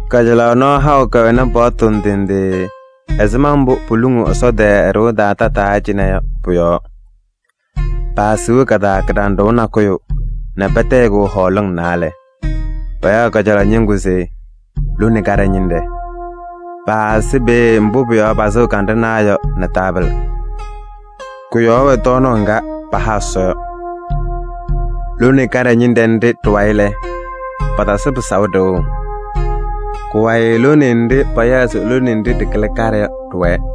Kajalaɣ nɔɔ haʋ kɛwɛnɩ paɣtʋ ndɩ ndɩ ɛzɩma mbʋ poluŋuu Ɛsɔ tɛɛ ɛ-ɖɩɣa taa tataa cɩnɛ yɔ pʋ-yɔɔ. Paasiɣ ka-taa kɩɖanɖʋʋ nakʋyʋ nɛ patayɩ-kʋ hɔɔlɩŋ naalɛ: payaɣ kajalaɣ ñɩŋgʋ se lone kaɖɛ ñɩnɖɛ. Paasɩ peeye mbʋ pʋ-yɔɔ pasɩɣ kanɖʋnaa yɔ nɛ taabɩlɩ. Kʋ-yɔɔ wɛ tɔɔnaɣ ŋga paha Ɛsɔ yɔ. Lone kaɖɛ ñɩnɖɛ nɖɩ ɖɩ-wayɩ lɛ, patasɩ pɩsaʋ ɖɩɣʋ. Kʋ-wayɩ lone nɖɩ payaɣ se lone nɖɩ ɖɩkɩlɩ kaɖɛ yɔ ɖɩwɛɛ.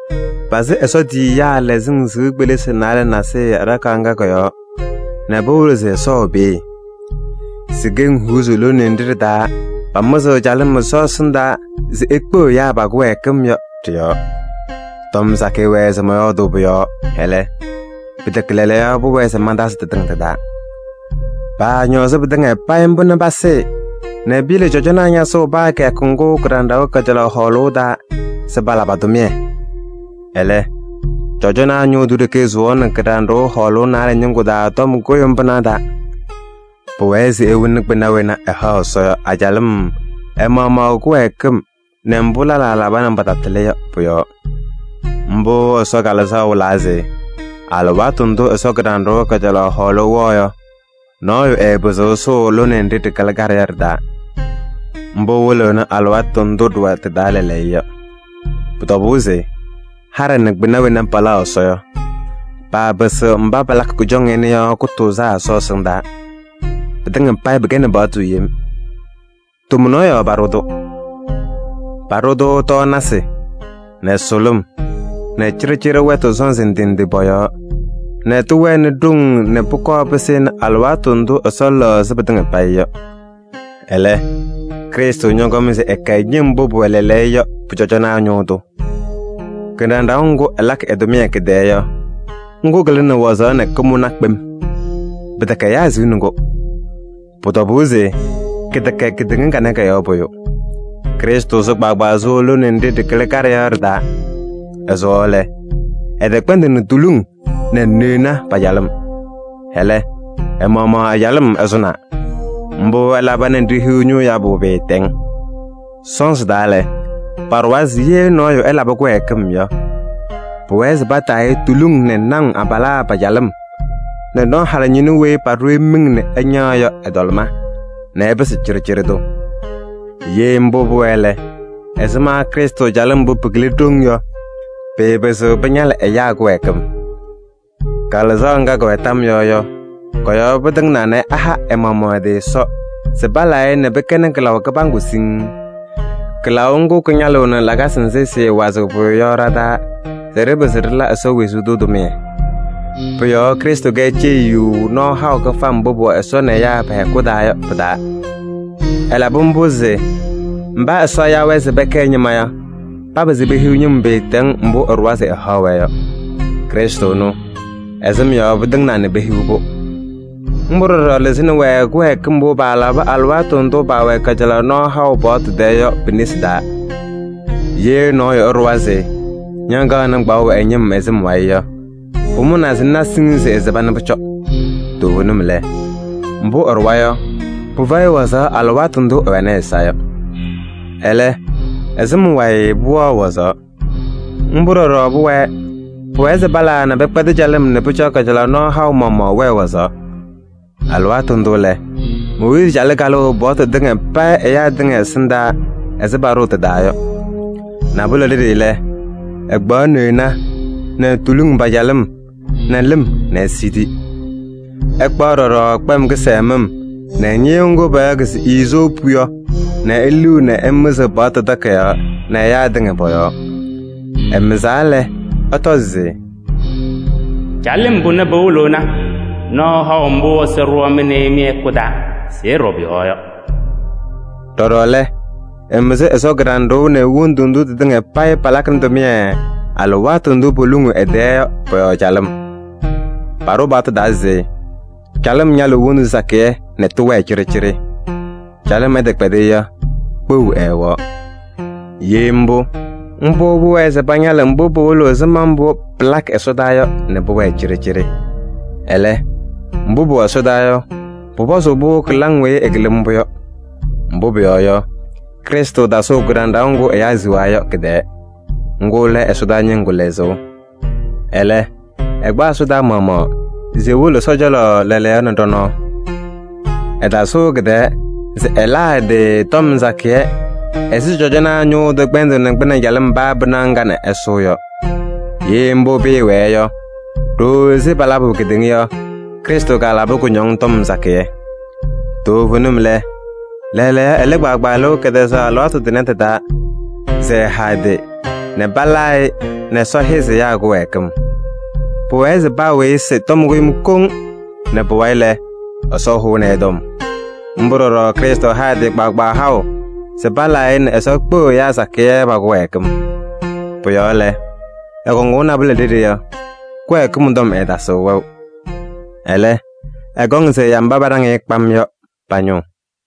Pasɩ Ɛsɔ tiyiyaa lɛzɩŋ sɩʋ kpelisi naalɛ nasɩyɩ aɖakaɣ ŋga kɔ-yɔɔ nɛ pɩwɩlɩɣ se Ɛsɔ wɛ peeye. Si-keŋ huuzi lone nɖɩ ɖɩ-taa pamɩzɩɣ calɩm Ɛsɔ ɛsɩndaa se ekpeɣ ɛyaa pa-kɩwɛɛkɩm yɔ, ɖɩ-yɔɔ. Tɔm sakɩyɛ wɛɛ se mɔyɔɔdʋʋ pʋ-yɔɔ, ɛlɛ, pɩtɛkɛ lɛɛlɛɛyɔ pʋwɛɛ se mantazɩ tɩtɩŋa tɩ-taa. Paañɔɔzɩ pɩtɩŋa payɩ mbʋ nɛ pasɩɩ nɛ piyele cɔjɔnaa ñasʋʋ paa kɩyakʋ ŋgʋ kɩɖanɖʋʋ kajalaɣ hɔɔlʋʋ taa se pala pa-tʋmɩyɛ. Ɛlɛ, cɔjɔnaa ñʋʋ tʋ ɖeke sʋwaɣnɩ kɩɖanɖʋʋ hɔɔlʋʋ naalɛ ñɩŋgʋ taa tɔm kʋɖʋm pɩnaɣ taa. Pʋwɛɛ se ewoni kpɩna wena ɛhaɣ Ɛsɔ yɔ a-calɩm ɛ-maɣmaɣ ɛ-kɩwɛɛkɩm nɛ mbʋ lɛlaa laba nɛ patatɩlɩ yɔ pʋ-yɔɔ. Mbʋ Ɛsɔ Kalɩzaɣ wɩlaa se: alɩwaatʋ ndʋ Ɛsɔ kɩɖanɖʋʋ kajalaɣ hɔɔlʋʋ wɛɣ yɔ, nɔɔyʋ ɛɛpɩzɩɣ ɛsʋʋ lone nɖɩ ɖɩkɩlɩ kaɖɛ yɔ ɖɩ-taa. Mbʋ wɩlɩɣnɩ alɩwaatʋ ndʋ ɖɩwɛ tɩ-taa lɛɛlɛɛyɔ yɔ. Pʋ-tɔbʋʋ se haɖɛ nɛ kpɩna wena palaɣ Ɛsɔ yɔ, paapɩsɩɣ mba palakɩ kʋjɔŋ ɩnʋ yɔ kʋtʋʋzaa Ɛsɔ ɛsɩndaa. Pɩtɩŋa payɩ pɩkɛnɩ paɣtʋ yem. Tomnaɣ yɔɔ paɖʋ-tʋ: paɖʋ-tʋ tɔɔnasɩ nɛ sʋlʋm nɛ cɩɖɩcɩɖɩ wɛtʋ sɔnzɩ ndɩ ndɩ pɔ-yɔɔ, nɛ tɩwɛnɩ ɖoŋ nɛ pʋkɔɔ pɩsɩnɩ alɩwaatʋ ndʋ Ɛsɔ lɛɣzɩ pɩtɩŋa payɩ yɔ. Ɛlɛ, Krɩstʋ ñɔkɔm se ɛkɛ ñɩm mbʋ pʋwɛ lɛɛlɛɛyɔ yɔ pʋ-cɔjɔnaa ñʋʋ tʋ. Kɩɖanɖʋʋ ŋgʋ ɛlakɩ ɛ-tʋmɩyɛ kɩ-tɛɛ yɔ, ŋgʋ kɩlɩnɩ wazaɣ nɛ kʋmʋna kpem. Pɩtɛkɛ ɛyaa siɣni-kʋ. Pʋ-tɔbʋʋ se kɩtɛkɛ kedeŋa kanɛ kɔ-yɔɔ pʋyʋ. Krɩstʋ sʋ kpaagbaa sʋʋ lone nɖɩ ɖɩkɩlɩ kaɖɛ yɔ ɖɩ-taa. Ɛsʋwaɣ lɛ, ɛtɛkpɛndɩnɩ tuluŋ nɛ neɣna pa-calɩm. Ɛlɛ, ɛ-maɣmaɣ ɛ-calɩm ɛsʋnaa. Mbʋ ɛlaba nɛ ɖihiɣ ñʋʋ yabʋ pɩɩtɛŋ. Sɔnzɩ taa lɛ, paɖʋwa se ye nɔɔyʋ ɛlabɩ kɩwɛɛkɩm yɔ, pʋwɛɛ se pataa-ɩ tuluŋ nɛ naŋ abalaa pa-calɩm nɛ nɔ halɩñɩnʋ weyi paɖʋ-ɩ miŋ nɛ ɛñaɣ yɔ ɛ-tɔlɩma nɛ ɛpɩsɩ cɩɖɩcɩɖɩ tʋ. Ye mbʋ pʋwɛɛ lɛ, ɛzɩma Krɩstʋ calɩm mbʋ pɩkɩlɩ ɖoŋ yɔ, pɩɩpɩzɩɣ pɩñalɩ ɛyaa kɩwɛɛkɩm! Kalɩzaɣ ŋga kɛwɛ tam yɔɔ yɔ, kɔ-yɔɔ pɩtɩŋnaa nɛ ɛha ɛ-maɣmaɣ ɛ-tɩ Ɛsɔ se palaa-ɩ nɛ pɩkɛnɩ kɩlaʋ kɩbaŋgʋ siŋŋ. Kɩlaʋ ŋgʋ kɩñalɩɣnɩ lakasɩ nzɩ sɩɩwazɩɣ pʋyʋ yɔ ɖa-taa se ɖɩpɩzɩ ɖɩla Ɛsɔ wezuu tʋ tʋmɩyɛ. Pʋ-yɔɔ Krɩstʋ kɛ ceyiyu nɔɔ haʋ kɩfam mbʋ pʋwɛ Ɛsɔ nɛ ɛyaa pɛ-hɛkʋ taa yɔ pɩ-taa. Ɛlabɩ mbʋ se mba Ɛsɔ ya-wɛ se pɛkɛ ɛ-ñɩma yɔ, papɩzɩ pehiɣ ñɩm pɩɩtɛŋ mbʋ ɛɖʋwa se ɛhaɣ-wɛ yɔ. Krɩstʋ ɛnʋ, ɛ-sɩm yɔɔ pɩtɩŋnaa nɛ pehiɣ-pʋ. Mbʋ ɖɔɖɔ lɩzɩnɩ-wɛ kɩwɛɛkɩm mbʋ paalabɩ alɩwaatʋ ndʋ paawɛ kajalaɣ nɔɔ haʋ paɣtʋ tɛɛ yɔ pi-nesi taa. Ye nɔɔyʋ ɛɖʋwa se ñakaɣnɩ kpaɣʋ ɛ-ñɩm ɛ-sɩm wayɩ yɔ, pʋmʋnaa se ŋna siŋŋ se ɛsɩba nɛ pʋcɔ. Toovenim lɛ, mbʋ ɛɖʋwa yɔ, pɩfɛyɩ wazaɣ alɩwaatʋ ndʋ ɛwɛnɩ ɛ-ɛza yɔ. Ɛlɛ, ɛ-sɩm wayɩ pʋwɛɣ wazaɣ. Mbʋ ɖɔɖɔ pʋwɛɛ: pʋwɛɛ se palaa nɛ pɛkpɛdɩ calɩm nɛ pʋcɔ kajalaɣ nɔɔ haʋ maɣmaɣ wɛɛ wazaɣ. Alɩwaatʋ ndʋ lɛ, Mooyiizi calɩ kalʋʋ paɣtʋ tɩŋa payɩ ɛyaa tɩŋa ɛsɩndaa ɛzɩ paɖʋʋ tɩ-taa yɔ. Nabʋlɛ ɖeɖe lɛ, ɛkpaɣ neɣna nɛ tuluŋ pa-calɩm nɛ lɩm nɛ esidi. Ɛkpaɣ ɖɔɖɔ kpɛm kɩsɛmɩm nɛ ñɩyʋʋ ŋgʋ payaɣ se iizoopu yɔ nɛ eliɣ nɛ ɛmɩzɩɣ paɣtʋ takayaɣ nɛ ɛyaa tɩŋa pɔ-yɔɔ. Ɛmɩzaa lɛ, ɛtɔ se: “Calɩm pʋnɛ pɩwɩlɩɣnɩ nɔɔ haʋ mbʋ Ɛsɔ ɖʋ mɩ nɛ ɩ mɩ-hɛkʋ taa se ɩɖɔ pʋ-yɔɔ yɔ.” Ɖɔɖɔ lɛ, ɛmɩzɩ Ɛsɔ kɩɖanɖʋʋ nɛ wondu ndʋ tɩtɩŋa payɩ palakɩnɩ tʋmɩyɛ alɩwaatʋ ndʋ poluŋuu ɛ-tɛɛ yɔ pɔ-yɔɔ calɩm. Paɖʋ paɣtʋ taa se calɩm ñalɩɣ wondu sakɩyɛ nɛ tɩwɛɛ cɩɖɩcɩɖɩ. Calɩm ɛtɛkpɛdɩ yɔ, kpeɣu ɛɛwɛɣ. Ye mbʋ, mbʋ pʋwɛɛ se pañalɩ mbʋ pɩwɩlɩɣ ɛzɩma mbʋ pɩlakɩ ɛsɔdaa yɔ nɛ pʋwɛɛ cɩɖɩcɩɖɩ. Ɛlɛ, mbʋ pʋwɛ ɛsɔdaa yɔ, pʋpɔzʋʋ-pʋ kɩlaŋ weyi ɩkɩlɩ mbʋ yɔ. Mbʋ pʋyɔɔ yɔ, Krɩstʋ tasʋʋ kɩɖanɖʋʋ ŋgʋ ɛyaa siɣaa yɔ kɩ-tɛɛ. Ŋgʋ lɛ ɛsɔdaa ñɩŋgʋ lɛzʋʋ. Ɛlɛ, ɛkpa ɛsɔdaa maɣmaɣ se ewolo Ɛsɔ cɔlɔ lɛɛlɛɛyɔ nɛ ɖɔ-nɔɔ. Ɛtasʋʋ kɩ-tɛɛ se ɛlaa ɛ-tɩ tɔm sakɩyɛ ɛzɩ cɔjɔnaa ñʋʋ tʋ kpɛndʋʋnɩ kpɩnɛ calɩm paa pɩnaɣ ŋga nɛ ɛsʋʋ yɔ. Ye mbʋ pɩɩwɛɛ yɔ, ɖooo ɛzɩ palabʋ kedeŋa yɔ, Krɩstʋ kalabɩ kʋñɔŋ tɔm sakɩyɛ. Toovenim lɛ, lɛɛlɛɛyɔ ɛlɩ kpaagbaa lɩʋ kɛtɛzaɣ alɩwaatʋ tʋnɛ tɩ-taa se ɛha ɛ-tɩ nɛ palaa-ɩ nɛ Ɛsɔ hɛzɩ ɛyaa kɩwɛɛkɩm. Pʋwɛɛ se paa weyi ɛsɩ tɔm kʋɖʋm koŋ nɛ pʋwayɩ lɛ, Ɛsɔ hʋnɩ-ɩ tɔm. Mbʋ ɖɔɖɔ Krɩstʋ ha ɛ-tɩ kpaagbaa haʋ se palaa-ɩ nɛ Ɛsɔ kpeɣ ɛyaa sakɩyɛ pa-kɩwɛɛkɩm. Pʋ-yɔɔ lɛ, ɛkɔŋʋʋ nabʋlɛ ɖeɖe yɔ, kɩwɛɛkɩm tɔm ɛɛtasɩɣ wɛʋ. Ɛlɛ, ɛkɔŋ se ɛya mba paɖaŋ-ɩ kpam yɔ pa-ñʋʋ.